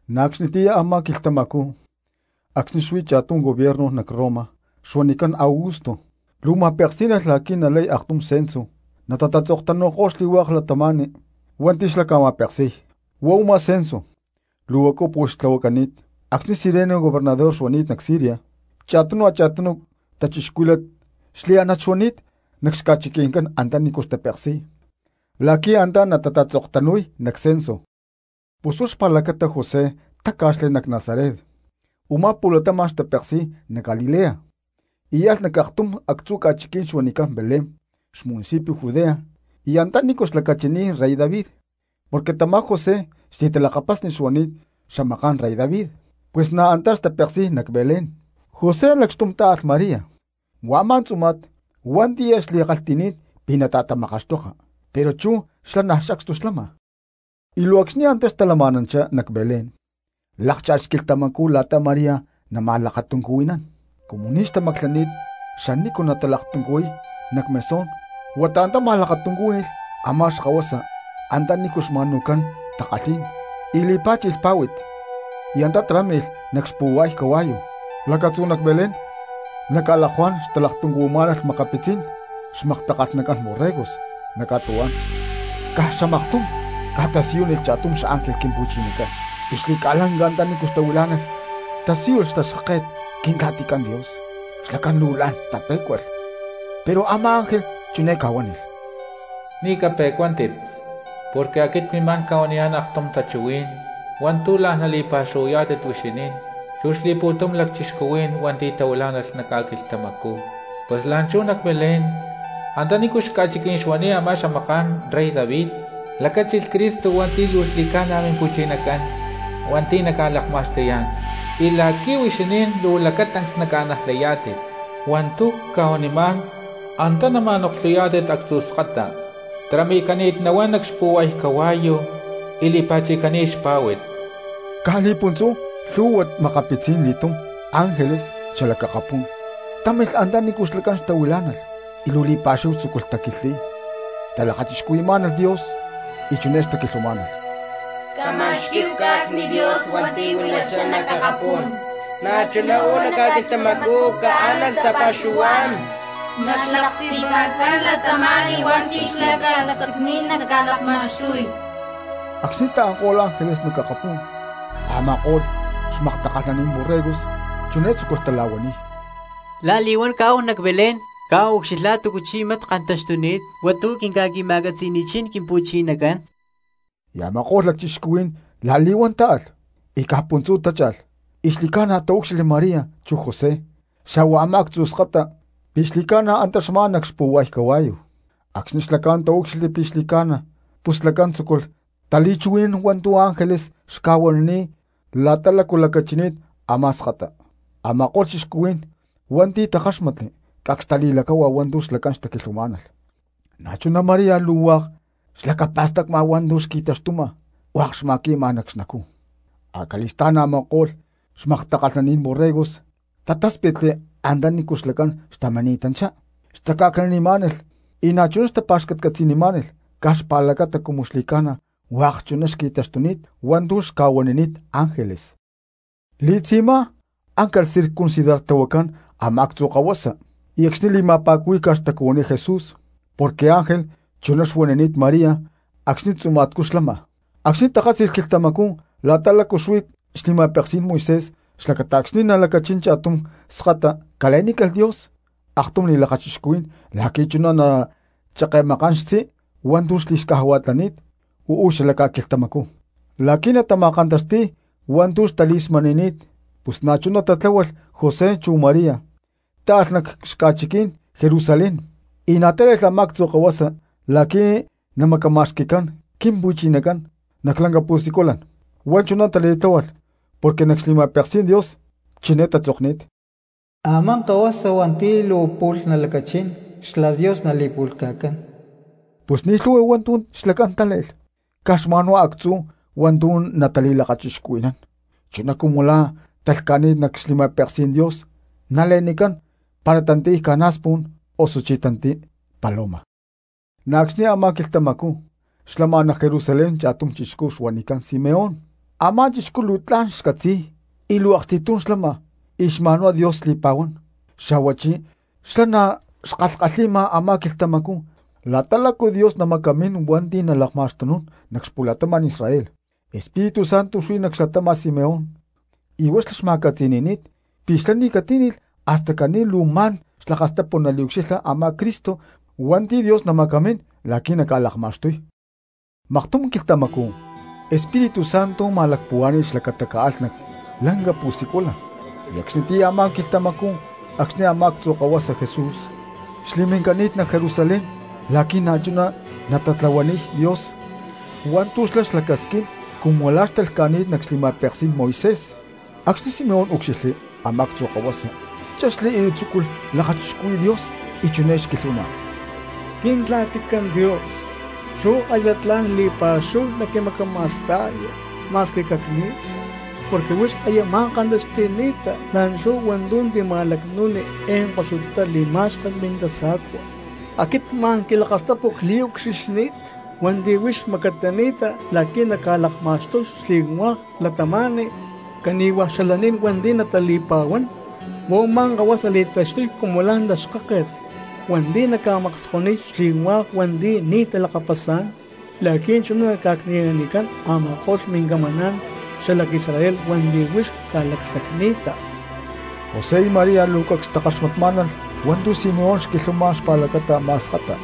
Na̠ acxnitiyá a̠má quilhtamacú acxni̠ xuí cha̠tum gobierno nac Roma xuanicán Augusto, luu ma̠peksí̠nalh la̠qui̠ nalay aktum censo y natatatzoktanu̠y xli̠hua̠k cristianos hua̠nti̠ xlá xca̠ma̠peksi̠y. Huá u̠má censo luu huacu pu̠lh tlahuacani̠t acxni̠ Cirenio gobernador xuani̠t nac Siria. Cha̠tunu cristianos xliánat xuani̠t nac xca̠chiqui̠ncán antanícu xtatapeksi̠y la̠qui̠ antá natatatzoktanu̠y nac censo. Pus huá xpa̠lacata José táca̠xli nac Nazaret, u̠má pu̠latama̠n xtapeksi̠y nac Galilea, y alh nac aktum actzu̠ ca̠chiquí̠n xuanicán Belén xmunicipio Judea y antanícu xlacachini̠t rey David, porque tamá José xli̠talakapasni xuani̠t xamaká̠n rey David, pus na̠ anta̠ xtapeksi̠y nac Belén. José lacxtum tá̠alh María huá a̠má tzuma̠t hua̠nti̠ aya xli̠kalhti̠ni̠t pi̠ nata̠tamakaxtoka, pero chú xlá niaj sacstu xlama. Y luu acxni̠ antá xtalama̠nanchá nac Belén lákcha̠lh quilhtamacú la̠ta María nama̠lakatuncuhui̠nán. Cumu ni̠ xtamaclani̠t xanícu natalaktuncuhui̠y nac mesón huata antá ma̠lakatuncúhui̠lh a̠má xkahuasa antanícu xca̠ma̠nu̠cán takalhí̠n, y li̠pá̠chi̠lh pá̠hui̠t y antá tarámi̠lh nac xpu̠hua̠y cahua̠yu. Lacatzú nac Belén nac ca̠lakuá̠n xtalaktuncuhuimá̠nalh makapitzí̠n xmaktakalhnacán borregos nac ca̠tuhuá̠n. Caj xamaktum ca̠tasiyúnilh cha̠tum xángel Quimpu̠chinacán y xli̠ca̠lanca antanícu xtahuilá̠nalh tasíyulh xtaxkáket Quintla̠ticán Dios. Xlacán luu la̠n tapé̠cualh. Pero a̠má ángel chiné ca̠huánilh: —Ni̠ cape̠cuántit porque cmimá̠n ca̠huaniyá̠n aktum tachuhuí̠n hua̠ntu̠ la̠n nali̠pa̠xuhuayá̠tit huixinín chu xli̠pu̠tum lacchixcuhuí̠n hua̠nti̠ tahuilá̠nalh nac ca̠quilhtamacú. Pus la̠nchú nac Belén antanícu xca̠chiquí̠n xuani̠t a̠má xamaká̠n rey David lacáchilh Cristo hua̠nti̠ luu xli̠ca̠na Mimpu̠chinacán hua̠nti̠ naca̠ma̠akapu̠taxti̠yá̠n. Y la̠qui̠ huixinín luu lacatancs naca̠najlayá̠tit hua̠ntu̠ cca̠huanimá̠n antá nama̠noklhuyá̠tit actzu̠ skata tarami̠cani̠t nahuán nac xpu̠hua̠y cahua̠yu y li̠pa̠chi̠cani̠t xpá̠hui̠t. Caj li̠puntzú lhu̠hua makapitzí̠n li̠túm ángeles xalac akapú̠n támilh antanícu xlacán xtahuilá̠nalh y luu li̠pa̠xúhu tzúculh taquilhtli̠y, xtalakachixcuhui̠má̠nalh Dios, chiné xtaquilhuamá̠nalh: ¡Cama̠xquí̠hu cá̠cni̠t Dios hua̠nti̠ huilachá nac akapú̠n! Na̠chuná uú nac ca̠quilhtamacú caánalh tapa̠xuhuá̠n nac xlaksti̠pa̠ncán cristianos hua̠nti̠ xlá ca̠lacsacni̠t naca̠lakma̠xtuy. Acxni̠ taanko̠lh ángeles nac akapú̠n, a̠ma̠ko̠lh xmaktakalhnaní̠n borregos chiné tzúculh tala̠huaniy: —La̠li̠huán caáhu nac Belén, caáhu ucxilhá̠hu túcu chí mat kantaxtuni̠t hua̠ntu̠ quinca̠qui̠ma̠catzi̠ni̠chín Quimpu̠chinacán. Y a̠ma̠ko̠lh lacchixcuhuí̠n la̠li̠huán táalh y caj puntzú tácha̠lh, y xli̠ca̠na taúcxilhli María chu José xa̠hua a̠má actzu̠ skata pi̠ xli̠ca̠na antá xmá nac xpu̠hua̠y cahua̠yu. Acxni̠ xlacán taúcxilhli pi̠ xli̠ca̠na, pus xlacán tzúculh tali̠chuhui̠nán hua̠ntu̠ ángeles xca̠huanini̠t la̠ta lácu xlacachini̠t a̠má skata. Ama̠ko̠lh cristianos hua̠nti̠ takáxmatli cacs tali̠lacáhua hua̠ntu̠ xlacán xtaquilhuamá̠nalh. Na̠chuná María luu hua̠k xlacapa̠stacma hua̠ntu̠ xkantaxtuma, y hua̠k xma̠químa nac xnacú. Acali̠stá̠n a̠ma̠ko̠lh xmaktakalhnaní̠n borregos tatáspitli antanícu xlacán xtamini̠tanchá, xtaca̠cni̠nanimá̠nalh y na̠chuná xtapa̠xcatcatzi̠nimá̠nalh caj xpa̠lacata cumu xli̠ca̠na hua̠k chuná xqui̠taxtuni̠t hua̠ntu̠ xca̠huanini̠t ángeles. Li̠tzi̠má áncalh circuncidartlahuacán a̠má actzu̠ kahuasa y acxni̠ li̠ma̠pa̠cuhuí̠ca xtacuhuiní Jesús porque ángel chuná xuanini̠t María acxni tzuma̠tcú xlama. Acxni̠ takátzi̠lh quilhtamacú la̠ta lácu xuí xli̠ma̠peksí̠n Moisés xlacata acxni̠ nalacachín cha̠tum skata cale̠nícalh Dios aktum li̠lakachixcuhui̠n la̠qui̠ chuná nacheke̠makán xtzí hua̠ntu̠ xli̠xcajua̠lani̠t uú xala ca̠quilhtamacú. La̠qui̠ na̠ natama̠kantaxti̠y hua̠ntu̠ xtali̠smani̠ni̠t pus na̠chuná tatláhualh José chu María táalh nac xaca̠chiquí̠n Jerusalén y na̠ tále̠lh a̠má actzu̠ kahuasa la̠qui̠ namacama̠xqui̠cán Quimpu̠chinacán nac lanca pu̠siculan antá. Huá chuná tali̠tláhualh porque nac xli̠ma̠peksí̠n Dios chiné tatzokni̠t: “Amá kahuasa hua̠nti̠ luu pu̠lh nalacachín xlá Dios nali̠pu̠lhca̠cán.” Pus ni̠ lhu̠hua hua̠ntu̠ xlacán tále̠lh caj xma̠nhuá actzú hua̠ntu̠ natali̠lakachixcuhui̠nán chuná cumu la̠ talhca̠ni̠t nac xli̠ma̠peksí̠n Dios nale̠nicán para tantiy ca̠na̠spu̠n osuchí tantiy paloma. Na̠ acxni̠ a̠má quilhtamacú xlama nac Jerusalén cha̠tum chixcú xuanicán Simeón. Amá chixcú luu tla̠n xcatzi̠y y luu aksti̠tum xlama y xma̠nhuá Dios xli̠pa̠huán, xa̠huachí xlá na̠ xkalhi̠ma a̠má quilhtamacú la̠ta lácu Dios namacamín hua̠nti̠ nalakma̠xtunún nac xapu̠latama̠n Israel. Espíritu Santo xuí nac xlatáma̠t Simeón y huá xlá xma̠catzi̠ni̠ni̠t pi̠ xlá ni̠ catíni̠lh hasta caní luu ma̠n xlakastapu naliucxilha a̠má Cristo hua̠nti̠ Dios namacamín la̠qui̠ naca̠lakma̠xtuy. Maktum quilhtamacú Espíritu Santo ma̠lacpuhuá̠ni̠lh xlacata caalh nac lanca pu̠siculan, y acxnitiyá a̠má quilhtamacú acxni̠ a̠má actzu̠ kahuasa Jesús xli̠mincani̠t nac Jerusalén la̠qui̠ na̠chuná natatlahuaniy Dios hua̠ntu̠ xlá xlacasquín cumu la̠ xtalhca̠ni̠t nac xli̠ma̠peksí̠n Moisés. Acxni̠ Simeón úcxilhli a̠má actzu̠ kahuasa chexli y tzúculh lakachixcuhui̠y Dios, chiné xquilhuama: Quintla̠ticán Dios, chú aya tla̠n li̠pa̠xúhu naquimacama̠sta̠ya ma̠squi cacni̠lh, porque huix aya ma̠kantaxti̠ni̠ta la̠nchú hua̠ntu̠ tima̠lacnu̠ni eé koxutá li̠ma̠xken mintasa̠cua. Aquit luu xli̠ca̠na ma̠n quilakastapu cliucxilhni̠t hua̠nti̠ huix macamini̠ta la̠qui̠ naca̠lakma̠xtuy xli̠hua̠k cristianos cani̠hua̠ xalaní̠n hua̠nti̠ natali̠pa̠huán. Huá u̠má kahuasa li̠taxtuy cumu la̠ taxkáket hua̠nti̠ naca̠makskoniy xli̠hua̠k cristianos hua̠nti̠ ni̠ talakapasá̠n, la̠qui̠ chuná naca̠cni̠nanicán a̠ma̠ko̠lh mincamaná̠n xalac Israel hua̠nti̠ huix ca̠lacsacni̠ta. José y María luu cacs xtakaxmatmá̠nalh hua̠ntu̠ Simeón xquilhuama xpa̠lacata a̠má skata.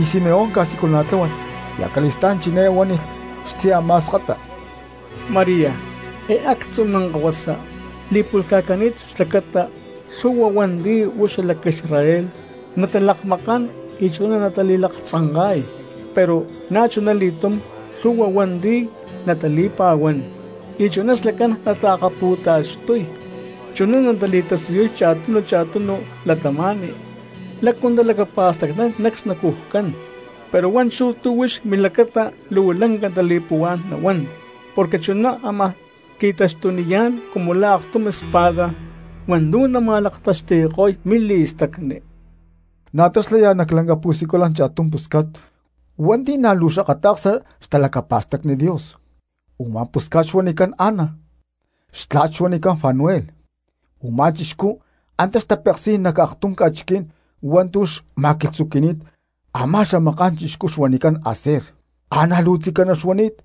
Y Simeón ca̠siculana̠tláhualh, y acali̠stá̠n chiné huánilh xtzí a̠má skata: —María, eé actzu̠ minkahuasa li̠pu̠lhca̠cani̠t xlacata lhu̠hua hua̠nti̠ uú xalac Israel natalakmakán y chuná natali̠laktzanka̠y, pero na̠chuna li̠túm lhu̠hua hua̠nti̠ natali̠pa̠huán y chuná xlacán natalaktaxtuy. Chuná natali̠tasiyuy cha̠tunu a̠cha̠tunu cristianos lácu talacapa̠stacnán nac xnacujcán; pero hua̠nchú tu̠ huix milacata luu lanca tali̠puhuá̠n nahuán porque chuná ámaj qui̠taxtuniyá̠n cumu lá aktum espada hua̠ntu̠ nama̠laktaxti̠ko̠y mili̠stacni. Na̠ antá xlaya nac lanca pu̠siculan cha̠tum pusca̠t hua̠nti̠ na̠ luu xakata̠ksa xtalacapa̠stacni Dios, u̠má pusca̠t xuanicán Ana; xtla̠t xuanicán Fanuel, u̠má chixcú antá xtapeksi̠y nac aktum ca̠chiquí̠n hua̠ntu̠ xma̠quilhtzuqui̠ni̠t a̠má xamaká̠n chixcú xuanicán Aser. Ana luu tzicaná xuani̠t,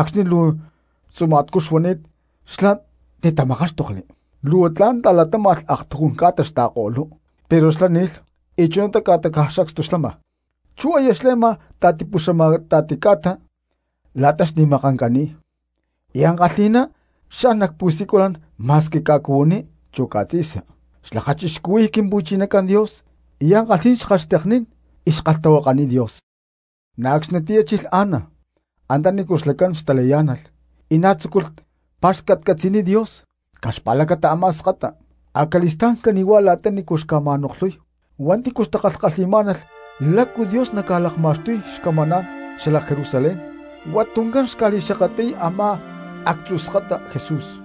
acxni̠ luu tzuma̠tcú xuani̠t xlá titamakáxtokli, luu tla̠n aktujún ca̠ta ta̠latáma̠lh xta̠ko̠lú, pero xlá ni̠lh y chunatá ca̠ta caj sacstu xlama. Chú aya xle̠ma ta̠tipuxamata̠ti ca̠ta la̠ta xni̠makancani̠t y ankalhi̠ná xan nac pu̠siculan ma̠squi ca̠cuhuiní chu ca̠tzi̠sa xlakachixcuhui̠y Quimpu̠chinacán Dios y ankalhí̠n xkalhxteknín y xkalhtahuakaniy Dios. Na̠ acxnitiyá chilh Ana antanícu xlacán xtalayá̠nalh y na̠ tzúculh pa̠xcatcatzi̠niy Dios caj xpa̠lacata a̠má skata. Acali̠stá̠n cani̠huá la̠tanícu xca̠ma̠noklhuy hua̠nti̠ xtakalhi̠má̠nalh lácu Dios naca̠lakma̠xtuy xcamaná̠n xalac Jerusalén huá tuncán xca̠li̠xakatli̠y a̠má actzu̠ skata Jesús.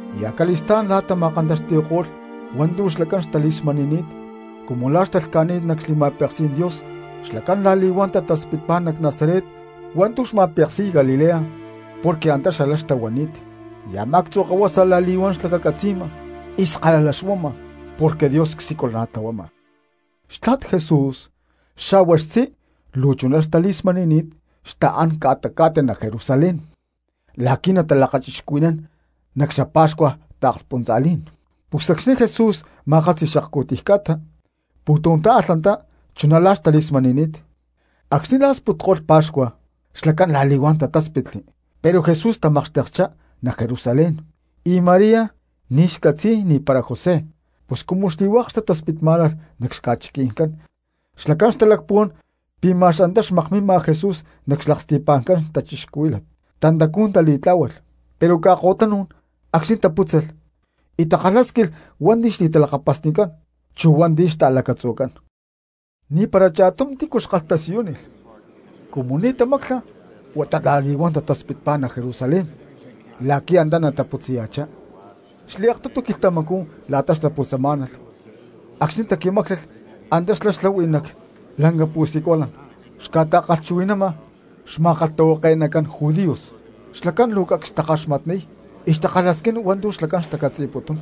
Y acali̠stá̠n la̠ tama̠kantaxti̠ko̠lh hua̠ntu̠ xlacán xtali̠smani̠ni̠t cumu la̠ xtalhca̠ni̠t nac xli̠ma̠peksí̠n Dios xlacán la̠li̠huán tataspitpá nac Nazaret hua̠ntu̠ xma̠peksi̠y Galilea porque antá xalá xtahuani̠t. Y a̠má actzu̠ kahuasa la̠li̠huán xlacacatzi̠ma y skala xuama porque Dios csiculana̠tlahuama. Xtla̠t Jesús xa̠hua xtzí luu chuná xtali̠smani̠ni̠t xtaa̠n ca̠ta cá̠ta nac Jerusalén la̠qui̠ natalakachixcuhui̠nán nac xapa̠xcua taakspuntza̠lí̠n. Pus acxni̠ Jesús ma̠kátzi̠lh xakcu̠tiy ca̠ta pu̠tum táalh antá chuná la̠ xtali̠smani̠ni̠t. Acxni̠ la̠ sputko̠lh pa̠xcua xlacán la̠li̠huán tatáspitli pero Jesús tamakxtekchá nac Jerusalén y María ni̠ xcatzi̠y ni̠para José. Pus cumu xli̠hua̠k cristianos xtataspitmá̠nalh nac xca̠chiqui̠ncán xlacán xtalacpuhuán pi̠ ma̠x antá xmakmima Jesús nac xlaksti̠pa̠ncán cristianos, tantacú tali̠tlá̠hualh pero ca̠ko̠tanú̠n acxni̠ tapútzalh y takalhásquilh hua̠nti̠ xli̠talakapasnicán chu hua̠nti̠ xta̠lacatzujcán, ni̠para cha̠tum tícu xkalhtasiyúnilh. Cumu ni̠ tamácla huata la̠li̠huán tataspitpá nac Jerusalén la̠qui̠ antá nataputzaya̠chá. Xli̠aktutu quilhtamacú la̠ta xtaputzamá̠nalh acxni̠ taqui̠máclalh antá xlá xlahui nac lanca pu̠siculan xca̠ta̠kalhchuhui̠nama xma̠kalhtahuake̠nacán judíos, xlacán luu cacs xtakaxmatniy y xtakalhasquín hua̠ntu̠ xlacán xtacatzi̠putún.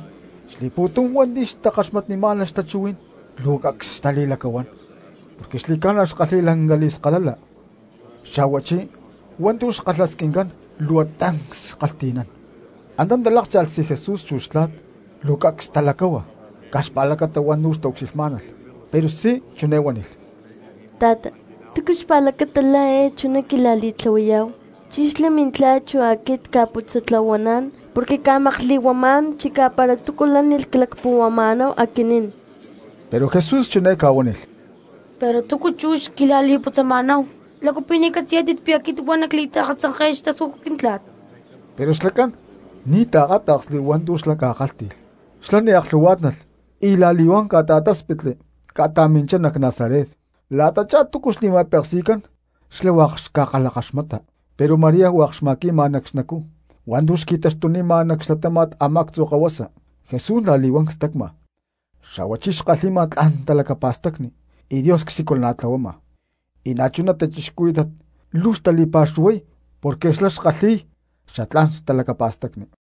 Xli̠pu̠tum hua̠nti̠ xtakaxmatnimá̠nalh xtachuhuí̠n luu xli̠ca̠na cacs xtali̠lacahuán porque xli̠ca̠na xkalhi̠y lanca li̠skalala, xa̠huachí hua̠ntu̠ xkalhasquincán luu tancs xkalhti̠nán. Antá talákcha̠lh xtzí Jesús chu xtla̠t, luu cacs talacáhua caj xpa̠lacata hua̠ntu̠ xtaucxilhmá̠nalh, pero xtzí chiné huánilh: —Ta̠ta, ¿túcu xpa̠lacata la̠ eé chuná quila̠li̠tlahuayá̠hu? Chí xlá mintla̠t chu aquit cca̠putzatla̠huaná̠n porque cca̠makli̠huamá̠n chicá para túcu lánilh clacpuhuama̠náhu aquinín. Pero Jesús chiné ca̠huánilh: —Pero ¿túcu chú xquila̠li̠putzama̠náhu? ¿Lácu pi̠ ni̠ catzi̠yá̠tit pi̠ aquit huá nacli̠taakatzanke̠y xtascújut quintla̠t? Pero xlacán ni̠ taakáta̠ksli hua̠ntu̠ xlá ca̠kálhti̠lh. Xlá ni̠ aklhu̠huá̠tnalh y la̠li̠huán ca̠ta̠táspitli y ca̠ta̠minchá nac Nazaret. La̠tachá túcu xli̠ma̠peksi̠cán xlá hua̠k xca̠kalhakaxmata. Pero María hua̠k xma̠qui̠ma nac xnacú hua̠ntu̠ xqui̠taxtunima nac xlatáma̠t a̠má actzu̠ kahuasa. Jesús la̠li̠huán cstacma xa̠huachí xkalhi̠ma tla̠n talacapa̠stacni y Dios csiculana̠tlahuama, y na̠chuná cristianos luu xtali̠pa̠xuhuay porque xlá xkalhi̠y xatlá̠n xtalacapa̠stacni.